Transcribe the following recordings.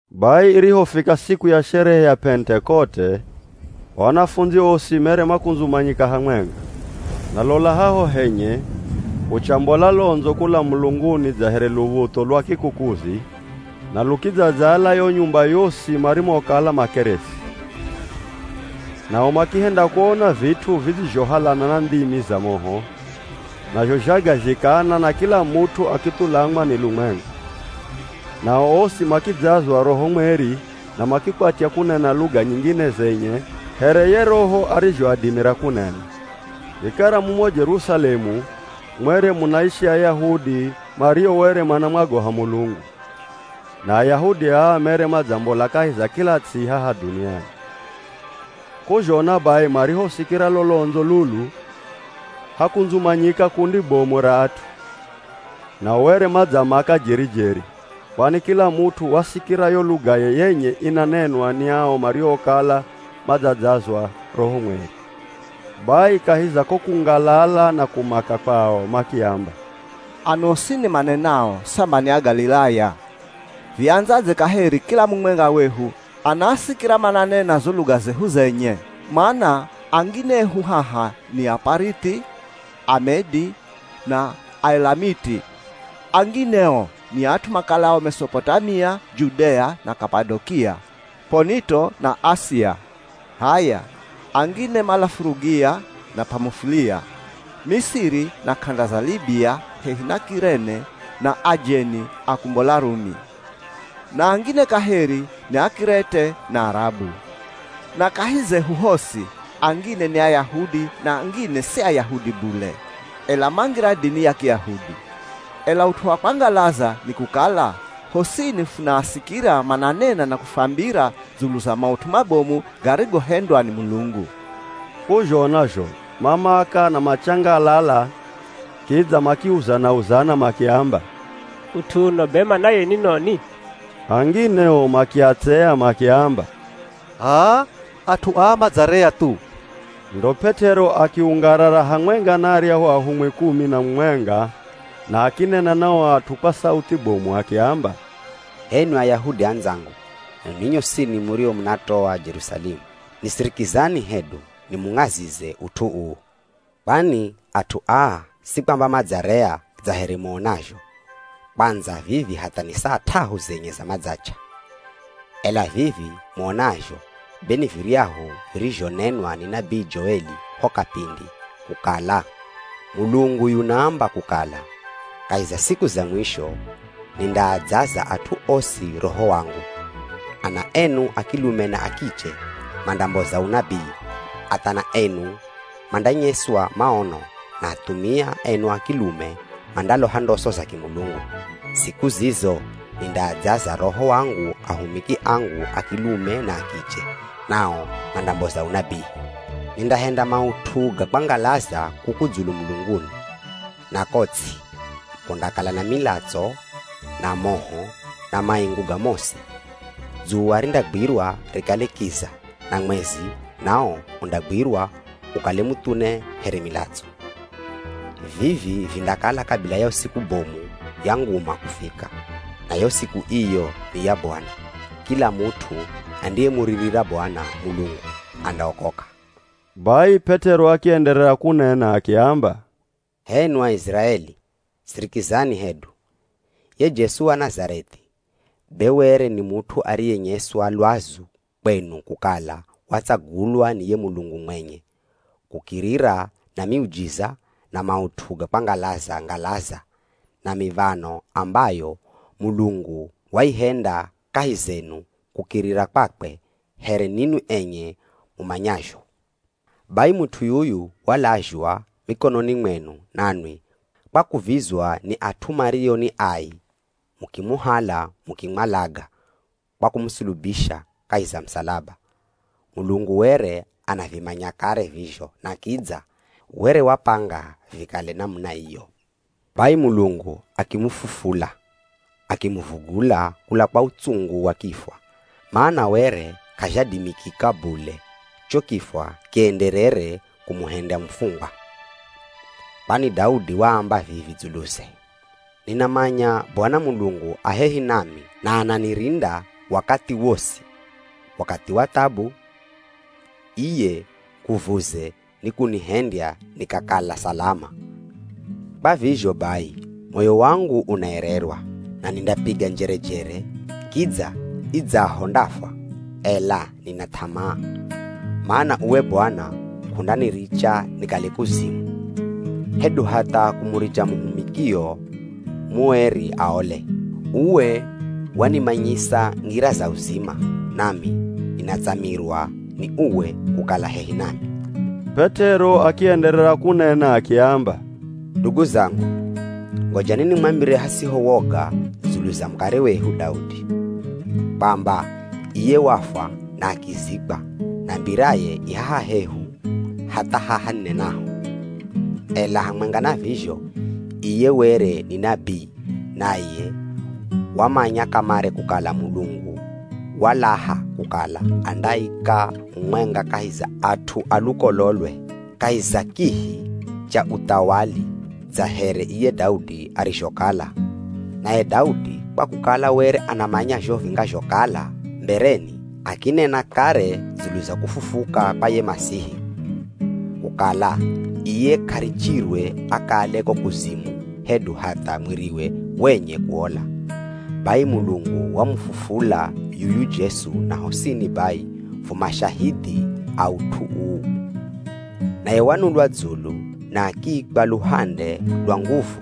Bai irihofika siku ya sherehe ya Pentekote, o anafundzi osi mere makundzumanyika hamwenga. Na lola haho henye kuchambola londzo kula mulunguni dza here luv̱utho lwa kikukuzi na lukidzadzala yo nyumba yosi marimokala makeresi. Nao makihenda kuona vit'u vidzizhohalana na ndhimi za moho, nazho zhagazhikana na kila mut'u akithulamwa ni lumwenga. Nao osi makidzazwa Roho Mweri na makikwatya kunena luga nyingine zenye here ye Roho arizhoadimira kunena. Vikara mumo Jerusalemu mwere munaishi Ayahudi mario were manamwogoha Mulungu, na Ayahudi aa mere madzambola kahi za kila ts'i haha dhuniani. K'uzhona bai marihosikira lo londzo lulu, hakundzumanyika kundi bomu ra at'u. Nao were madzamaka jeri-jeri, kwani kila mut'u wasikira yo lugaye yenye inanenwa ni ao mariokala madzadzazwa Roho Mweri. Bai kahi za ko kungalala na kumaka kwao, makiamba, “Ano osini manenao samba ni Agalilaya, viandzadze kaheri kila mumwenga wehu anaasikira mananena zo luga zehu zenye? Mana angine ehu haha ni, Aparithi, Amedi, na Aelamiti. Angine o ni at'u makalao Mesopotamia, Judea, na Kapadokia, P'onito na Asia. H'aya, angine mala Furugia na P'amufulia, Misiri na k'anda za Libia hehi na K'irene na ajeni akumbola Rumi. Na angine kaheri ni Ak'irete na Arabu. Na kahi zehu hosi, angine ni Ayahudi na angine si Ayahudi bule, ela mangira dini ya Kiyahudi. Ela ut'u wa kwangalaza nikukala, hosini funaasikira mananena na kufwambira dzulu za maut'u mabomu garigohendwa ni Mulungu!” K'uzhona zho mamaka na machangalala kidza makiuzana-uzana makiamba, “Ut'u uno be manaye ni noni?” Angine o makiatsea makiamba, “H'aa, at'u aa madzarea thu.” Ndo P'et'ero akiungarara hamwenga na aryahu ahumwi kumi na mumwenga na akinena na o at'u kwa sauthi bomu akiamba, “H'enwi Ayahudi andzangu na ninwi nyosini murio munatoa Jerusalemu, nisirikizani hedu nimung'azize ut'u uu. Kwani at'u aa si kwamba madzarea dza here muonazho, kwandza vivi hatha ni saa t'ahu zenye za madzach'a! Ela vivi muonazho be ni viryahu virizhonenwa ni nabii Joeli ho kapindi, kukala ‘Mulungu yunaamba kukala kahi za siku za mwisho nindaadzaza at'u osi Roho wangu. Ana enu a kilume na a kiche mandamboza unabii. Athana enu mandanyeswa maono, na athumia enu a kilume mandaloha ndoso za kimulungu. Siku zizo nindaadzaza Roho wangu ahumiki angu a kilume na a kiche, nao mandamboza unabii. Nindahenda maut'u ga kwangalaza kuku dzulu mulunguni na ko ts'i, kundakala na milatso, na moho, na maingu ga mosi. Dzuwa rindagwirwa rikale kiza na mwezi nawo undagwirwa ukale muthune here milatso. Vivi vindakala kabila yo siku bomu ya nguma kufika, na yo siku iyo ni ya Bwana. Kila mut'u andiyemuririra Bwana Mulungu andaokoka.’” Bai P'et'ero akienderera kunena akiamba, “H'enwi Aiziraeli, sirikizani hedu! Ye Jesu wa Nazareth'i be were ni mut'u ariyenyeswa lwazu kwenu kukala watsagulwa ni ye Mulungu mwenye, kukirira na miujiza, na maut'u ga kwangalaza-ngalaza, na miv̱ano ambayo Mulungu waihenda kahi zenu kukirira kwakwe here ninwi enye mumanyazho. Bai mut'u yuyu walazhwa mikononi mwenu nanwi kwa kuvizwa ni at'u mario ni ai mukimuhala mukimwalaga kwa kumusulubisha kahi za musalaba. Mulungu were anavimanya kare vizho na kidza were wapanga vikale namuna iyo. Bai Mulungu akimufufula, akimuvugula kula kwa utsungu wa kifwa, mana were k'azhadimikika bule cho kifwa kienderere kumuhendya mufungwa. Kwani Daudi waamba vivi dzuluze, ‘Ninamanya Bwana Mulungu a hehi nami na ananirinda wakathi wosi, wakathi wa thabu iye nguvuze nikunihendya nikakala salama. Kwa vizho bai moyo wangu unaererwa na nindapiga njerejere, kidza idzaho ndafwa, ela nina th'amaa, mana uwe Bwana k'undaniricha nikale kuzimu, hedu hatha kumuricha muhumikio mueri aole. Uwe wanimanyisa ngira za uzima, nami ninatsamirwa ni uwe kukala hehi nami.’” P'et'ero akienderera kunena akiamba, “Ndugu zangu, ngojani nimwambire hasiho woga dzulu za mukare wehu Daudi, kwamba iye wafwa na akizikwa, na mbiraye i haha hehu hatha haha ninenaho. Ela hamwenga na vizho iye, were ni nabii naye wamanya kamare kukala Mulungu walaha kukala andaika mumwenga kahi za at'u a lukololwe kahi za kihi cha uthawali dza here iye Daudi arizhokala. Naye Daudi kwa kukala were anamanya zho vingazhokala mbereni, akinena kare dzulu za kufufuka kwa ye Masihi, kukala iye k'arichirwe akale ko kuzimu, hedu hatha mwiriwe wenye kuola! Bai Mulungu wamufufula yuyu Jesu na hosini bai fu mashahidhi a ut'u uu. Naye wanulwa dzulu na akiikwa luhande lwa nguvu,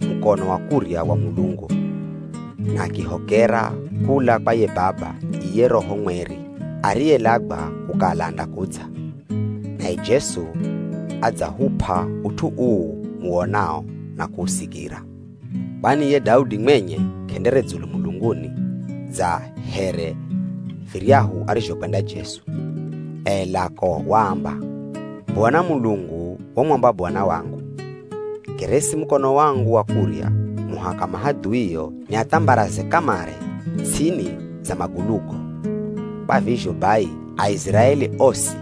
mukono wa kurya wa Mulungu, na akihokera kula kwa ye Baba iye Roho Mweri ariyelagwa kukala andakudza, naye Jesu adzahup'a ut'u uu muwonao na kuusikira. Kwani ye Daudi mwenye k'endere dzulu mulunguni dza here viryahu arizhokwenda Jesu, ela ko waamba, ‘Bwana Mulungu wamwamba Bwana wangu, “Keresi mukono wangu wa kurya, muhaka mahadhuio niathambaraze kamare ts'ini za magulugo.” ’ “Kwa vizho bai, Aiziraeli osi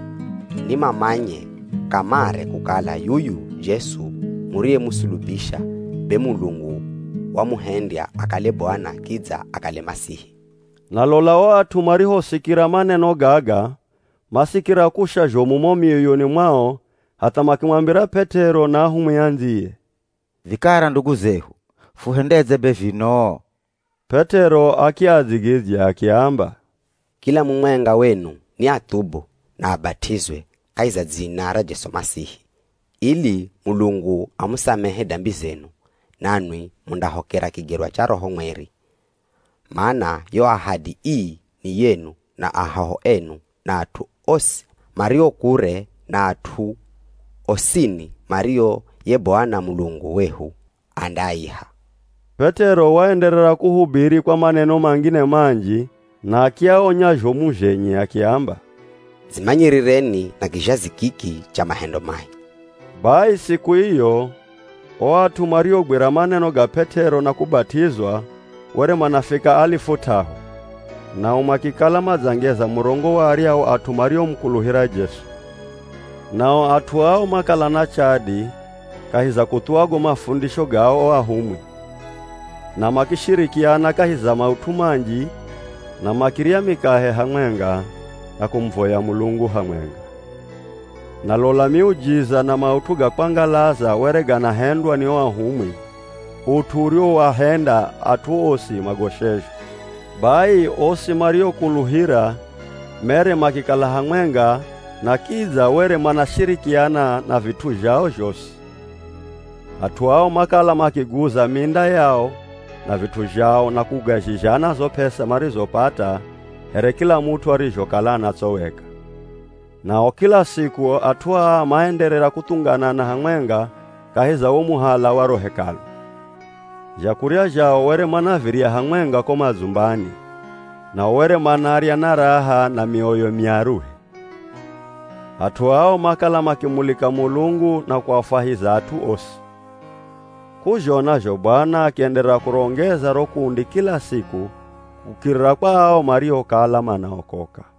ni mamanye kamare kukala yuyu Jesu muriyemusulubisha, be Mulungu wamuhendya akale Bwana kidza akale Masihi!” Na lola o at'u marihosikira maneno gaga masikira kusha zhomu mo mioyoni mwao hatha makimwambira P'et'ero na ahumwi andziye “Vikara ndugu zehu, fuhendedze be vinoo?” P'et'ero akiadzigidzya akiamba, “Kila mumwenga wenu ni athubu na abat'izwe kahi za dzina ra Jesu Masihi, ili Mulungu amusamehe dambi zenu. Nanwi mundahokera kigerwa cha Roho Mweri. Mana yo ahadi ii, ni yenu na ahoho enu na at'u osi mario kure na at'u osini mario ye Bwana Mulungu wehu andaaiha.” P'et'ero waenderera kuhubiri kwa maneno mangine manji na akiaonya zhomu zhenye akiamba, “Dzimanyirireni na kizhazi kiki cha mahendo mai.” Bai siku iyo o at'u mariogwira maneno ga P'et'ero na kubat'izwa were manafika alifu t'ahu, nao makikala madzangeza murongo wa aryahu at'u mariomukuluhira Jesu. Nao at'u ao makala na chadi kahi za kuthuwa go mafundisho ga o ahumwi, na makishirikiana kahi za maut'u manji na makirya mikahe hamwenga, na kumuvoya Mulungu hamwenga. Na lola miujiza na maut'u ga kwangalaza were ganahendwa ni o ahumwi, ut'u uriwoahenda at'u osi magoshezhwe. Bai osi mariokuluhira mere makikala hamwenga na kidza were manashirikiana na vit'u zhao zhosi. At'u ao makala makiguza minda yao na vit'u zhao na kugazhizhana zo p'esa marizopata here kila mut'u arizhokala anatsoweka. Nao kila siku at'u aa maenderera kuthunganana hamwenga kahi za wo muhala wa ro Hekalu. Zhakurya zhao were manavirya hamwenga ko madzumbani, nao were manarya na raha na mioyo myaruhe. At'u ao makala makimulika Mulungu na kuafwahiza at'u osi. K'uzhona zho Bwana akienderera kurongeza ro kundi kila siku kukirira kwa ao mariokala manaokoka.